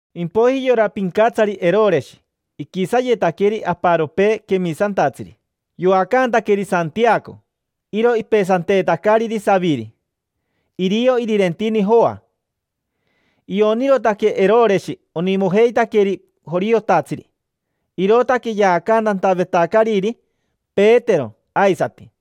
Impoiji yora pincatsari Eroreshi iquisayetaqueri aparopee quemisantatsiri. Yoacantaqueri Santiaco, iro ipesanteetacariri saviri, peti. Irio irirentini Joa. Ionirotaque Eroreshi onimojeitaqueri joriotatsiri, irootaque yaacantantavetacariri Petero aisati.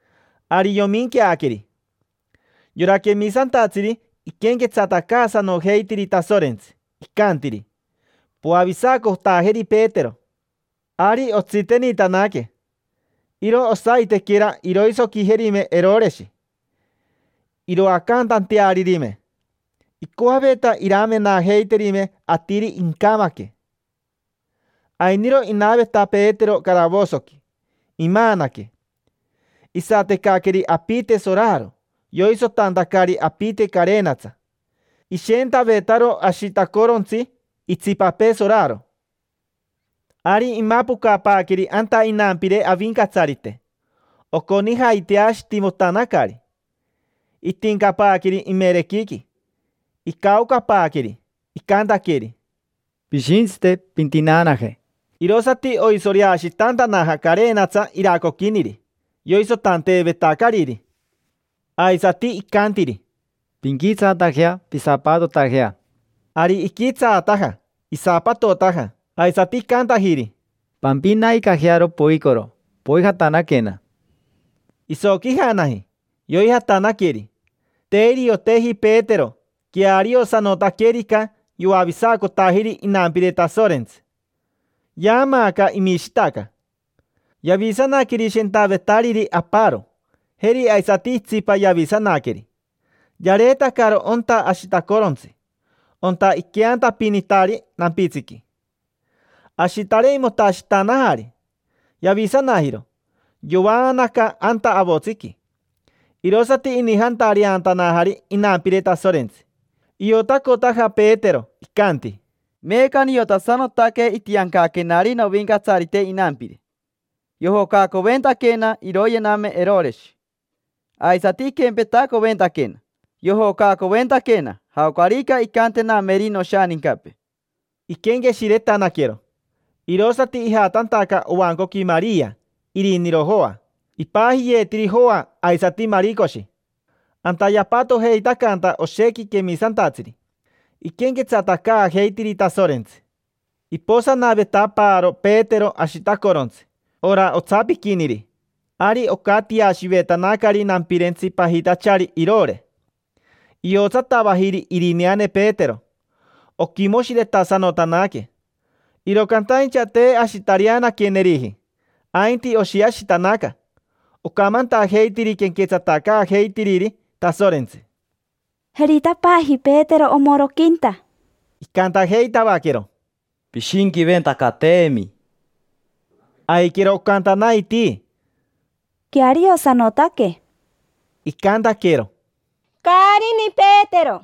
Ari yominqueaqueri. Yora quemisantatsiri iquenquetsatacaasanojeitiri Tasorentsi, icantiri: “Poavisacotajeri Petero”. Ari otsitenitanaque, iro osaitequera iroisoquijerime Eroreshi, iroacaantantearirime. Icoaveta iramenajeiterime atiri incamaque. Ainiro inaveta Petero caravosoqui, imaanaque; isatecaqueri apite soraro. Yoisotantacari apite carenatsa. Ishentavetaro ashitacorontsi itsipapee soraro. Ari imapocapaaqueri anta inampire Avincatsarite. Oconijaiteashitimotanacari. Itincapaaqueri imerequiqui, icaocapaaqueri. Icantaqueri: —Pishintsite pintinaanaje. Irosati oisoreashitantanaja carenatsa iracoquiniri, yoisotantavetacariri. Aisati icantiri: —Pinquitsaatajea, pisapatotajea. Ari iquitsaataja, isapototaja. Aisati icantajiri: —Pampinaicajearo poicoro, poijatanaquena. Isoquijanaji, yoijatanaqueri. Te irioteji Petero queariosanotaquerica yoavisacotajiri inampire Tasorentsi. Yaamaaca imishitaca. Yavisanaqueri shentavetariri aparo, jeri aisati itsipa yavisanaqueri. Yareetacaro onta ashitacorontsi, onta iquenantapinitari nampitsiqui. Ashitareimotashitanajari. Yavisanajiro, yovaanaca anta avotsiqui. Irosati inijantareantanajari inampire Tasorentsi. Iotacotaja Petero, icanti: —Meeca niotasanotaque itiancaquenari Novincatsarite inampire. Yojocaacoventaquena iroyename Eroreshi. Aisati iquempetacoventaquena, yojocaacoventaquena jaocarica incantenameri noshanincapee. Iquenqueshiretanaquero, irosati ijatantaca ovancoqui Maria, iriniro Joa. Ipajiyeetiri Joa aisati Maricoshi. Anta yapatojeitacanta oshequi quemisantatsiri, iquenquetsatacaajeitiri Tasorentsi. Iposanavetapaaro Petero ashitacorontsi, ora otsapiquiniri: toc, toc. Ari ocatiashivetanacari nampirentsi pajitachari Irore. Iotsatavajiri irineane Petero, oquimoshiretasanotanaque. Iro cantaincha te ashitareanaqueneriji, ainti oshiashitanaca. Ocamantajeitiri quenquetsatacaajeitiriri Tasorentsi: —Jeritapaaji Petero omoroquinta. Icantajeitavaquero: —Pishinquiventacateemi. Aiquero ocantanaitii: —Queariosanotaque. Icantaquero: —Caari ini Petero,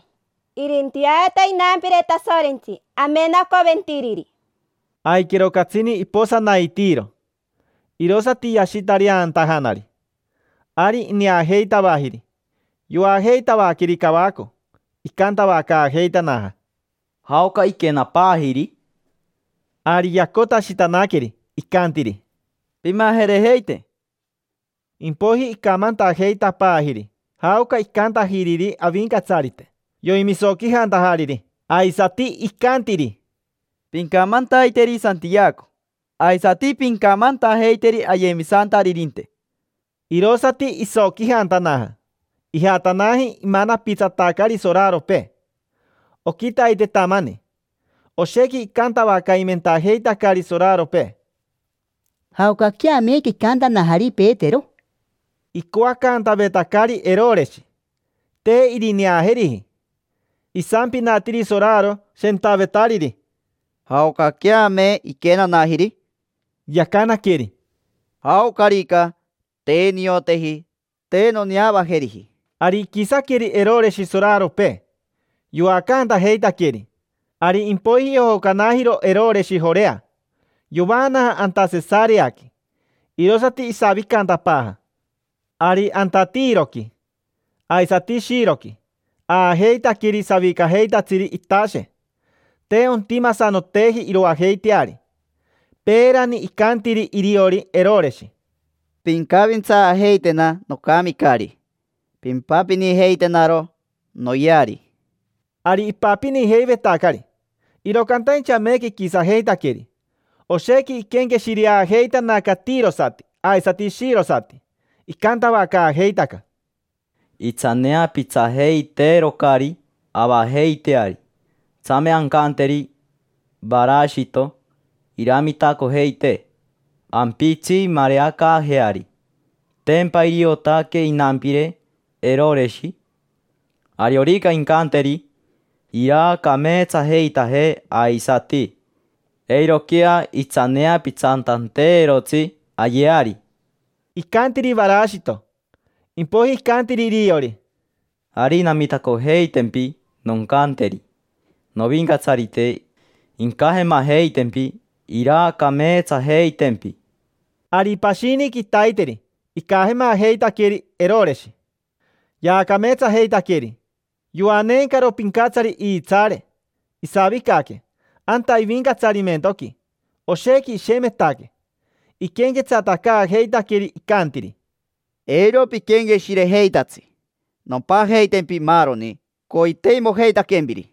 irintiata inampire Tasorentsi, amenacoventiriri. Aiquero catsini iposanaitiiro, toc, toc, irosati yashitareantajanari. Ari ineajeitavajiri, yoajeitavaqueri cavaco, icantavacaajeitanaja: —¿Jaoca iquenapaajiri? Ari yacotashitanaqueri, icantiri: —Pimajerejeite. Impoiji icamantajeitapaajiri jaoca icantajiriri Avincatsarite, yoimisoquijantajariri. Aisati icantiri: —Pincamantaiteri Santiaco, aisati pincamantajeiteri ayemisantaririnte. Irosati isoquijantanaja, ijatanaji imanapitsatacari soraropee. Oquitaitetamani oshequi icantavacaimentajeitacari soraropee: —¿Jaocaquea meeca icantanajari Petero? Icoacantavetacari Eroreshi, te irineajeriji. Isampinatiri soraro shentavetariri: —¿Jaocaqueame iquenanajiri? Yacanaqueri: —Caa, jaocarica, te nioteji; te noneavajeriji. Ari iquisaqueri Eroreshi soraropee, yoacantajeitaqueri, shemi. Ari impoiji yojocanajiro Eroreshi Jorea, yovaanaja anta Sesareaqui, irosati isavicantapaaja. Ari anta Tiroqui aisati Shiroqui aajeitaqueri savicajeitatsiri itashe, te ontimasanoteji iroajeiteari. Peerani icantiri iriori Eroreshi: —Pincavintsaajeitena, nocamicari. Pimpapinijeitenaro noyeari. Ari ipapinijeivetacari, iro cantaincha meeca iquisajeitaqueri. Oshequi iquenqueshireajeitanaca tirosati aisati shirosati. Icantavacaajeitaca: —Itsaneapitsajeiteerocari avajeiteari. Tsame ancanteri Varashito iramitacojeitee ampitsimareacaajeari: tempa iriotaque inampire Eroreshi. Ariorica incanteri, iraacameetsajeitajee aisati, eiroquea itsaneapitsatanteerotsi ayeari. Icantiri Varashito; impoiji icantiri iriori: —Ari, namitacojeitempi. Noncanteri novincatsarite incajemajeitempi, iraacameetsajeitempi. Ari pashini quitaiteri icajemajeitaqueri Eroreshi, yaacameetsajeitaqueri. Yoaneencaro pincatsari iitsaare, isavicaque anta ivincatsarimentoqui. Oshequi ishemetaque, iquenquetsatacaajeitaqueri. Icantiri: —Eiro piquenqueshirejeitatsi. Nompajeitempi maaroni coiteimojeitaquempiri.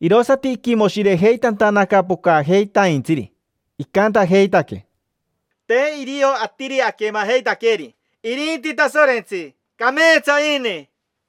Irosati iquimoshirejeitantanaca pocajeitaintsiri, icantajeitaque: —Te irio atiri aquemajeitaqueri, irinti Tasorentsi. Cameetsa ini.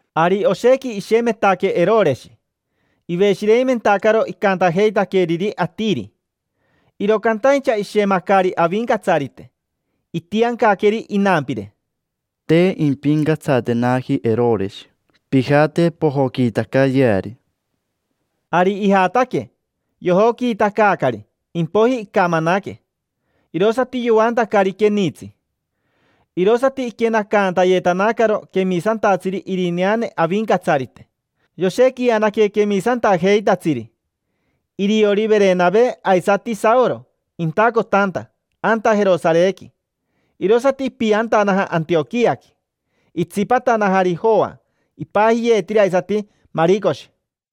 Ari oshequi ishemetaque Eroreshi, iveshireimentacaro icantajeitaqueriri atiri. Iro cantaincha ishemacari Avincatsarite, itiancaqueri inampire: —Te impincatsatenaji Eroreshi. Pijate pojoquiitacayeari. Ari ijataque, yojoquitacaacari, impoiji icamanaque, torein, irosati yoantacari quenitsi. Irosati iquenacaantayetanacaro quemisantatsiri irineane Avincatsarite. Yoshequianaque quemisantajeitatsiri. Iriori Verenave, aisati Saoro intacotanta anta Jerosarequi. Irosati ipiantanaja Antioquiaqui, itsipatanajari Joa, ipajiyeetiri aisati Maricoshi.